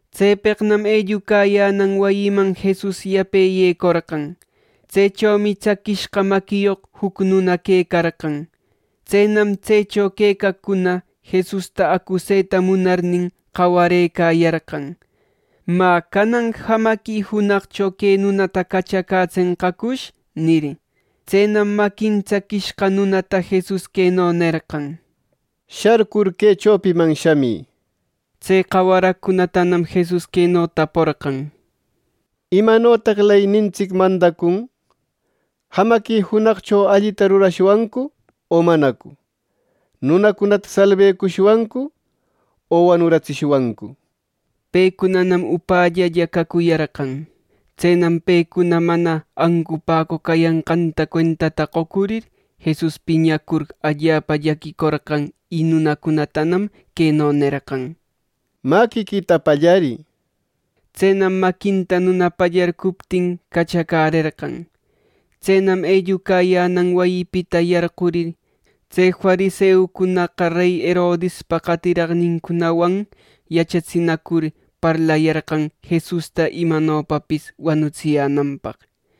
Tsepeqnam ellucayänan wayiman Jesus yape yecorqan. Tsechomi tsaquishqa maquiyoq juc nuna quecarqan. Tsenam tsecho quecaqcuna Jesusta acuseta munarnin, qawarëcayarqan. —Mä, ¿canan jamaqui junaqcho que nunata cachacätsenqacush? —nir. Tsenam maquin tsaquishqa nunata Jesus queno nerqan: —Sharcur que chopiman shämï —nir. Tse qawaraqcunatanam Jesus queno taporqan: —¿Imanotaq leynintsic mandacun! ¿Jamaqui junaqcho allita rurashwancu o manacu! ¿Nunacunata salbecushwancu o wanuratsishwancu! Pecunanam upällalla cacuyarqan. Tsenam pecuna mana ancupäcoq cayanqanta cuentata qocurir, Jesus piñacur allapa llaquicorqan. Y nunatanam queno nerqan: —Maquiquita pallarï. Tsenam maquinta nuna pallarcuptin cachacärerqan. Tsenam ellucayänan wayipita yarqurirna, tse fariseucunaqa rey Herodispa qatiraqnincunawan yachatsinacur parlayarqan Jesusta imanopapis wanicatsiyänanpaq.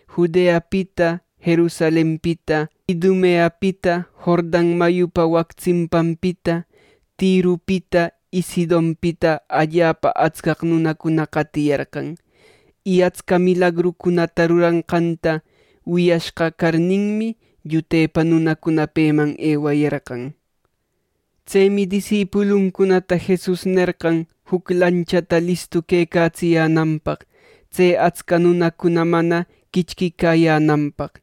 Judeapita, Jerusalenpita, Idumeapita, Jordan mayupa wac tsimpanpita, Tiropita y Sidonpita allapa atscaq nunacuna qatiyarqan. Y atsca milagrucunata ruranqanta wiyashqa carninmi, llutepa nunacuna peman ewayarqan. Tsemi disipuluncunata Jesus nerqan juc lanchata listu quecatsiyänanpaq, tse atsca nunacunam mana quichquiyänanpaq.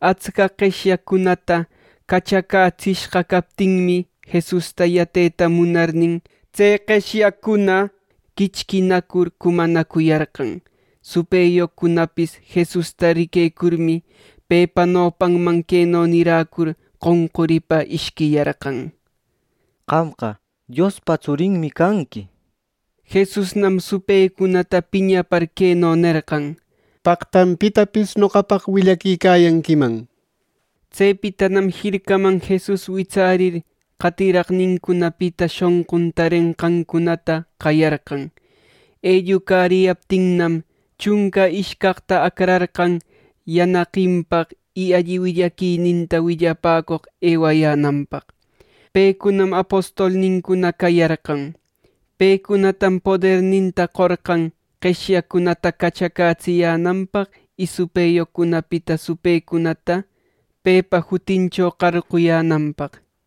Atscaq qeshyaqcunata cachacätsishqa captinmi, Jesusta yateta munarnin, tse qeshyaqcuna quichquinacur cumanacuyarqan. Supëyoqcunapis Jesusta riquecurmi, pepa nopanman queno niräcur, qonquripa ishquiyarqan: —Qamqa Diospa tsurinmi canqui —nir. Jesusnam supëcunata piñapar queno nerqan: —¡Paqtam pitapis noqapaq willaquicayanquiman! —nir. Tsepitanam jircaman Jesus witsärir qatiraqnincunapita shonqun tarenqancunata qayarqan. Ellucariyaptinnam, chunca ishcaqta acrarqan yanaqinpaq, y alli willaquita willapäcoq ewayänanpaq. Pecunam apostolnincuna cayarqan. Pecunatam poderninta qorqan ˻qeshyaqcunata cachacätsiyänanpaq˼ y supëyoqcunapita supëcunata pepa jutincho qarquyänanpaq.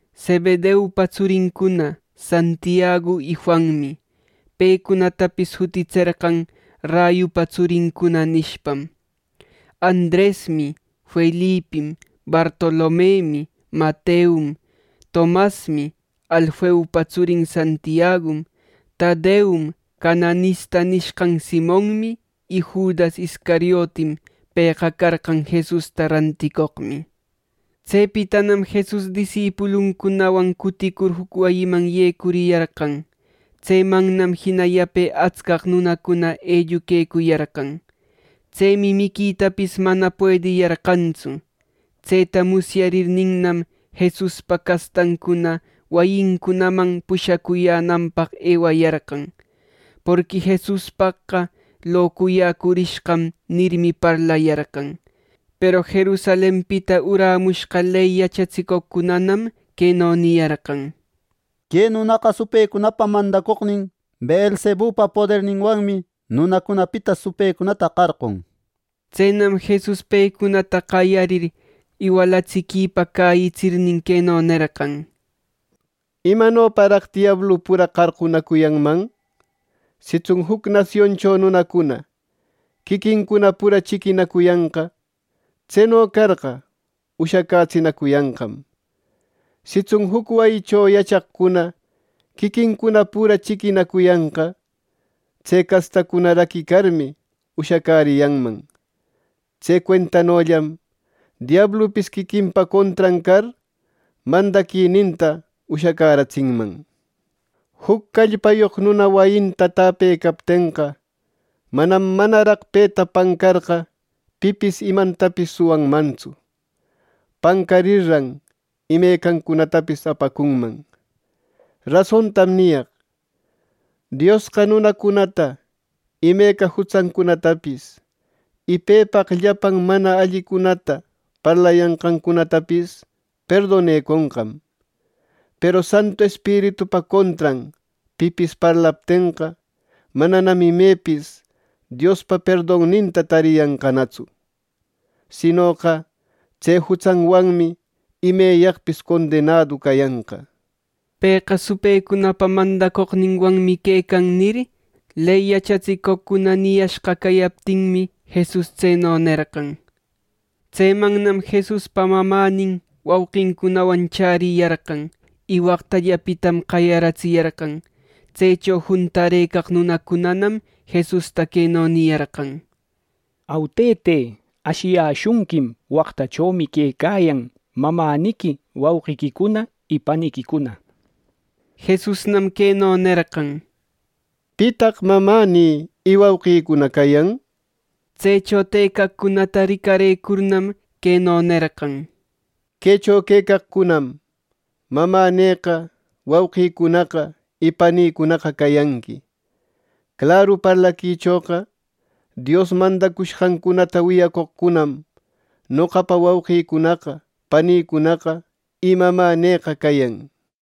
Zebedeupa tsurincuna Santiagu y Juanmi (pecunatapis jutitserqan rayupa tsurincuna, nishpam) Andresmi; Felipim; Bartolomemi; Mateom; Tomasmi; Alfeupa tsurin Santiagum; Tadeom; Cananista nishqan Simonmi y Judas Iscariotim. Pëqa carqan Jesusta ranticoqmi. Tsepitanam Jesus disipuluncunawan cuticur juc wayiman yecuriyarqan. Tsemannam jina yape atscaq nunacuna elluquecuyarqan. Tsemi miquitapis mana puediyarqantsu. Tseta musyarirninnam, Jesuspa castancuna wayincunaman pushacuyänanpaq ewayarqan. Porqui Jesuspaqqa “Locuyäcurishqam” nirmi, parlayarqan. Peru Jerusalenpita uramushqa ley yachatsicoqcunanam queno niyarqan: —Que nunaqa supëcunapa mandacoqnin Beelzebupa poderninwanmi nunacunapita supëcunata qarqun —nir. Tsenam Jesus pecunata qayarir iwalatsiquipa cäyitsirnin, queno nerqan: “¿Imanoparaq diablu pura qarqunacuyanman? Sitsun juc nasioncho nunacuna quiquincuna pura chiquinacuyanqa. Tseno carqa, ushacätsinacuyanqam. Sitsun juc wayicho yachaqcuna quiquincuna pura chiquinacuyanqa, tse castacuna raquicarmi, ushacäriyanman. Tse cuentanollam diablupis quiquinpa contran car mandaquininta ushacäratsinman. “Juc callpayoq nuna wayinta täpecaptenqa, manam manaraq peta pancarqa pipis imantapis suwanmantsu. Pancarirran imecancunatapis apacunman. “Rasontam niyaq: Diosqa nunacunata imeca jutsancunatapis, y pepaq llapan mana allicunata parlayanqancunatapis perdoneconqam. Peru Santu Espiritupa contran pipis parlaptenqa, mananam imepis Diospa perdonninta tariyanqanatsu, sinoqa tse jutsanwanmi imeyaqpis condenadu cayanqa.” “Pëqa supëcunapa mandacoqninwanmi quecan” nir, ley yachatsicoqcuna niyashqa cayaptinmi, Jesus tseno nerqan. Tsemannam Jesuspa mamänin wauqincunawan chäriyarqan. Y waqtallapitam qayaratsiyarqan. Tsecho juntarëcaq nunacunanam Jesusta queno niyarqan: —Au, tëte, ashiyäshunquim waqtachomi quecayan mamäniqui, wauqiquicuna y paniquicuna. Jesusnam queno nerqan: —¿Pitaq mamänï y wauqïcuna cayan? Tsecho tëcaqcunata ricarëcurnam, queno nerqan: —Quecho quecaqcunam mamänïqa wauqïcunaqa y panïcunaqa cayanqui. Claru parlaquichoqa Dios mandacushqancunata wiyacoqcunam noqapa wauqïcunaqa panïcunaqa y mamänïqa cayan.